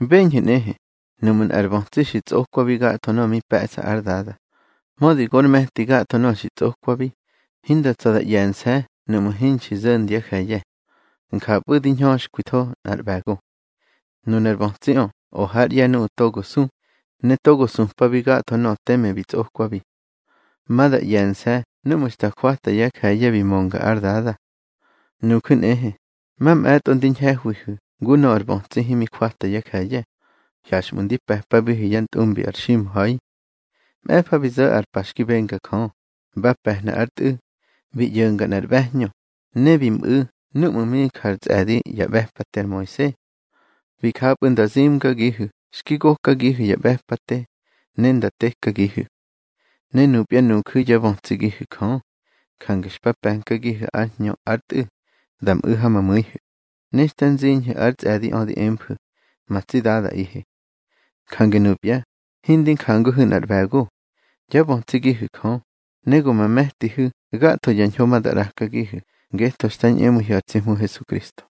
Beñhu̱ nꞌehe, nuꞌmu̱ nꞌar bötsi xi tsꞌokwabi gatho nöꞌö mi pe̱ꞌsa ár dada, mödi gor me̱ti gatho nöꞌö xi tsꞌokwabi, hinda tsa̱ da ꞌye̱nse̱ nuꞌmu̱ hinxi zo̱ndyá je̱ye̱. Njapꞌu̱ di hñöxkwitho nꞌar ꞌbe̱go. Nunar bötsiꞌö o hár ꞌye̱ nuꞌu̱ togo su, ne togo supabi gatho nöꞌö teme bi tsꞌokwabi. Ma da ꞌye̱nse̱ núꞌmu̱ xta jwata yá je̱ye̱ bi mönga ár dada. Nuju̱ nꞌehe, mamꞌe̱tꞌo ndi ñhe̱hwihu̱ ngu nöꞌö ar bötsi himi jwata yá je̱ye̱, hyaxꞌmu̱ ndi pe̱pabihu̱ yá ntꞌumbi ar ximha̱i. Mꞌe̱fa bi zo̱ ar pa xki benga Jö, ba pe̱hna ár Tꞌu̱, bi ꞌyo̱nga nꞌar ꞌbe̱hñö, ne bi mꞌu̱ núꞌmu̱ mi jár tsꞌe̱di yá ꞌbe̱pate ar Moise. Bi japꞌu̱ nda zimgagihu̱ xki gokagihu̱ ya ꞌbe̱pate, ne nda tekagihu̱. Ne nupya nuju̱ yá bötsigihu̱ Jö. Jange xpa pe̱nkagihu̱ ár Hñö ár Tꞌu̱ da mꞌu̱ ha ma mu̱ihu̱, ne xta nziñhu̱ ár tsꞌe̱diꞌö di emfu̱: Ma tsi Dadaꞌihe. Jange nupya, hindi njanguhu̱ nꞌar ꞌbe̱go. Yá bötsigihu̱ Jö, ne go ma me̱tihu̱ gatho ya ñho ma da ꞌrakagihu̱ ngetho xta ñꞌemu̱ihu̱ ar tsi Hmu Hesukristo.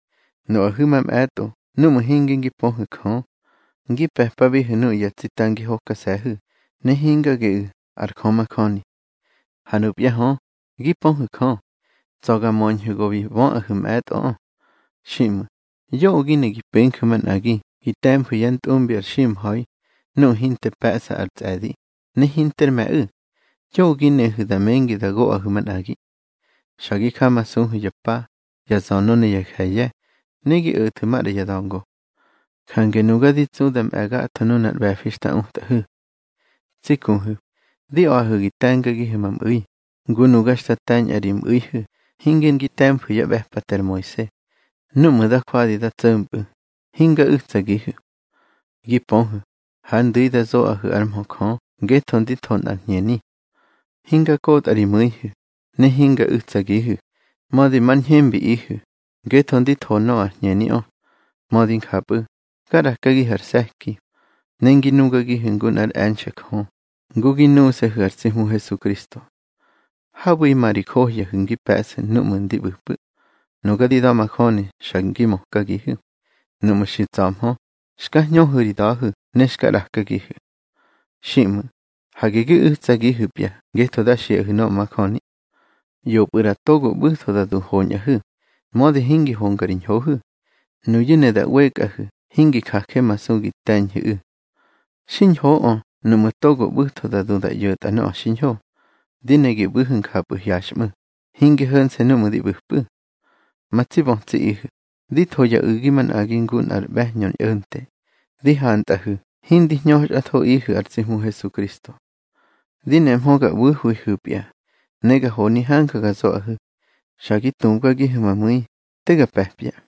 Nuꞌahu̱ mamꞌe̱tꞌo núꞌmu̱ hinge ngi pöhu̱ Jö, ngi pe̱pabihu̱ nuꞌu̱ ya tsita ngi hokase̱hu̱, ne hinga geꞌu̱ ar Jö majöni. Ha nupya hö, gi pöhu̱ Jö, tsa̱ ga möñhu̱ go bi böꞌahu̱ mꞌe̱tꞌoꞌö. Xiꞌmu̱, yoꞌö gi ne gi penju̱ manꞌagi gi te̱mfu̱ yá ntꞌumbi ar ximha̱i nuꞌu̱ hinte pe̱ꞌsa ar tsꞌe̱di, ne hinter me̱ꞌu̱. Yoꞌö gi nehu̱ da mengi da goꞌahu̱ manꞌagi. Xa gi jamasuhu̱ ya pa, ya zönö ne ya je̱ye̱, ne gi o̱thu̱ maꞌra ya da̱ngo. Jange nuga di tsu da mꞌe̱ gatho nunar ꞌbe̱fi xta utꞌahu̱. Tsi kuhu̱, di a̱ꞌahu̱ gi te̱ngagihu̱ ma mꞌu̱i, ngu nuga xta te̱ñꞌa ri mꞌu̱ihu̱ hinge ngi te̱mfu̱ yá ꞌbe̱pate ar Moise. Núꞌmu̱ da jwadi nda tso̱mpꞌu̱, hinga u̱tsagihu̱. Gi pöhu̱, hár ndu̱i da zoꞌahu̱ ár mhö Jö ngetho ndi tho nꞌar hñeni. Hinga kotꞌa ri mu̱ihu̱, ne hinga u̱tsagihu̱, mödi mar ñhembiꞌihu̱, ngetho ndi tho nöꞌö ar hñeniꞌö. Mödi njapꞌu̱, ga ꞌrakagihu̱ ar se̱ki, ne ngi nugagihu̱ ngu nꞌár e̱nxe̱ Jö, ngu gi nuse̱hu̱ ar tsi Hmu Hesukristo. Habu̱ima ri johyahu̱ ngi pe̱ꞌsu̱ núꞌmu̱ ndi ꞌbu̱pꞌu̱. Nuga di da̱majöni xa ngi mökagihu̱. Nuꞌmu̱ xi tsa̱hmö, xka hñöhu̱ ri da̱hu̱ ne xka ꞌrakagihu̱. Xiꞌmu̱, hage gi u̱tsagihu̱pya ngetho da xiꞌahu̱ nöꞌö majöni. ꞌYopꞌu̱ ꞌra togo ꞌbu̱tho da du hoñꞌahu̱, mödi hingi honga ri ñhohu̱. Nuyu̱ ne da ꞌwekꞌahu̱ hingi jajemasu gi te̱ñhu̱ꞌu̱. Xiñhoꞌö nuꞌmu̱ togo ꞌbu̱tho da du da ꞌyo̱tꞌa nöꞌö xiñho. Di ne gi ꞌbu̱hu̱ njapꞌu̱ hyaxꞌmu̱, hinge ho̱nse̱ núꞌmu̱ di ꞌbu̱pꞌu̱. Ma tsi bötsiꞌihu̱, di tho ya u̱gi manꞌagi ngu nꞌar ꞌbe̱hñö ñꞌo̱nte, di hantꞌahu̱ hindi hñöxꞌathoꞌihu̱ ar tsi Hmu Hesukristo. Di nemhö ga ꞌbu̱hwihu̱pya, ne ga honi hanja ga zoꞌahu̱. Xa gi tubgagihu̱ ma mu̱i, te ga pe̱pya.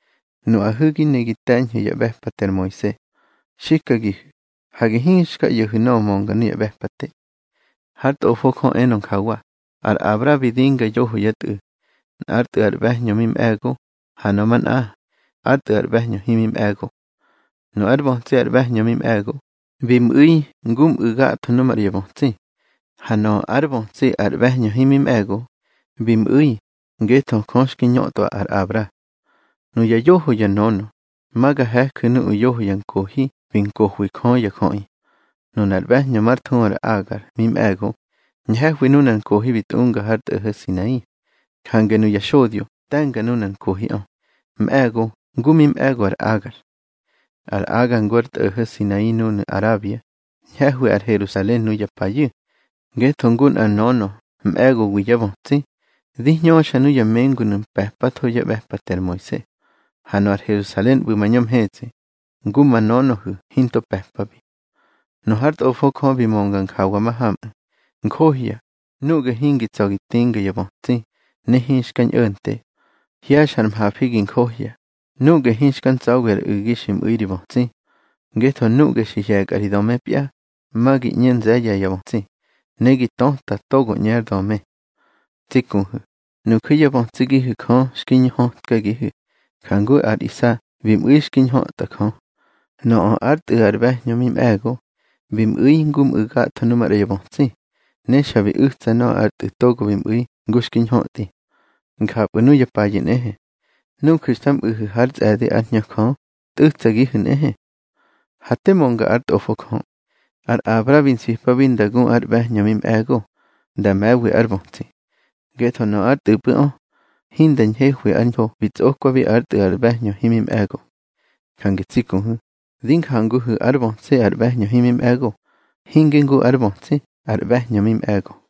Nuꞌahu̱ gi ne gi te̱ñhu̱ yá ꞌbe̱pate ar Moise, xikagihu̱: Hage hinxka ꞌyo̱hu̱ nöꞌö mönga nuya ꞌbe̱pate. Hár Tꞌofo Jö enö njawa: Ar Abra bi dinga yoho yá tꞌu̱. Nꞌár tꞌu̱ ar ꞌbe̱hñö mi mꞌe̱go, ha nöꞌö manꞌa, ár tꞌu̱ ar ꞌbe̱hñö himi mꞌe̱go. Nu ár bötsi ar ꞌbe̱hñö mi mꞌe̱go, bi mꞌu̱i ngu mꞌu̱ gatho nu maꞌra ya bötsi. Ha nöꞌö ár bötsi ar ꞌbe̱hñö himi mꞌe̱go, bi mꞌu̱i ngetho Jö xki ñötꞌwa ar Abra. Nuya yoho ya nönö, ma ga he̱ju̱ nuꞌu̱ yoho ya nkohi bi nkohwi Jö ya jöꞌi. Nunar ꞌbe̱hñö mar thuhu ar Agar mi mꞌe̱go, ñhe̱hwi nunar nkohi bi tꞌunga har tꞌo̱ho̱ Sinai. Jange nuya xodyo te̱nga nunar nkohiꞌö, mꞌe̱go ngu mi mꞌe̱go ar Agar. Ar Agar ngu ar tꞌo̱ho̱ Sinai núnu̱ Arabia, ñhe̱hwi ar Herusalen nuya payu̱. Ngetho ngu nꞌar nönö mꞌe̱gowi yá bötsi, di hñöxa nuya mengunu̱ pe̱patho yá ꞌbe̱pate ar Moise. Ha nöꞌö ar Herusalen ꞌbu̱ mañö mhetsꞌi, ngu ma nönöhu̱ hinto pe̱pabi. Nu hár Tꞌofo Jö bi mönga njawa mahamꞌu̱: Njohya, nuꞌge hingi tsa̱ gi tinga ya bötsi, ne hinxka ñꞌo̱nte. Hye̱xa ar mhafi gi njohya, nuꞌge hinxka ntsa̱wi ar u̱gi xi mꞌu̱i ri bötsi. Ngetho nuꞌge xi hye̱kꞌa ri dömebya, ma gi ꞌñe nze̱ye̱ ya bötsi, ne gi töta togo ꞌñe ár döme. Tsi kuhu̱, nuju̱ yá bötsigihu̱ Jö xki ñhötkagihu̱, jangu ar Isa bi mꞌu̱i xki ñhötꞌa Jö. Nöꞌö ár tꞌu̱ ar ꞌbe̱hñö mi mꞌe̱go, bi mꞌu̱i ngu mꞌu̱ gatho nuꞌu̱ maꞌra ya bötsi, ne xa bi u̱tsa nöꞌö ar tꞌu̱ togo bi mꞌu̱i ngu xki ñhötꞌi. Njapꞌu̱ nuya payu̱ nꞌehe. Nuju̱ xta mꞌu̱hu̱ hár tsꞌe̱di ár Hñö Jö, tꞌu̱tsagihu̱ nꞌehe. Ha te mönga ár Tꞌofo Jö. Ar Abra bi nsipabi nda gu ar ꞌbe̱hñö mi mꞌe̱go, nda me̱wi ár bötsi. Ngetho nöꞌö ár tꞌu̱pꞌu̱ꞌö, hinda ñhehwi ar hño bi tsꞌokwabi ár tꞌu̱ ar ꞌbe̱hñö himi mꞌe̱go. Jange tsi kuhu̱, di njanguhu̱ ár bötsi ar ꞌbe̱hñö himi mꞌe̱go, hinge ngu ár bötsi ar ꞌbe̱hñö mꞌe̱go.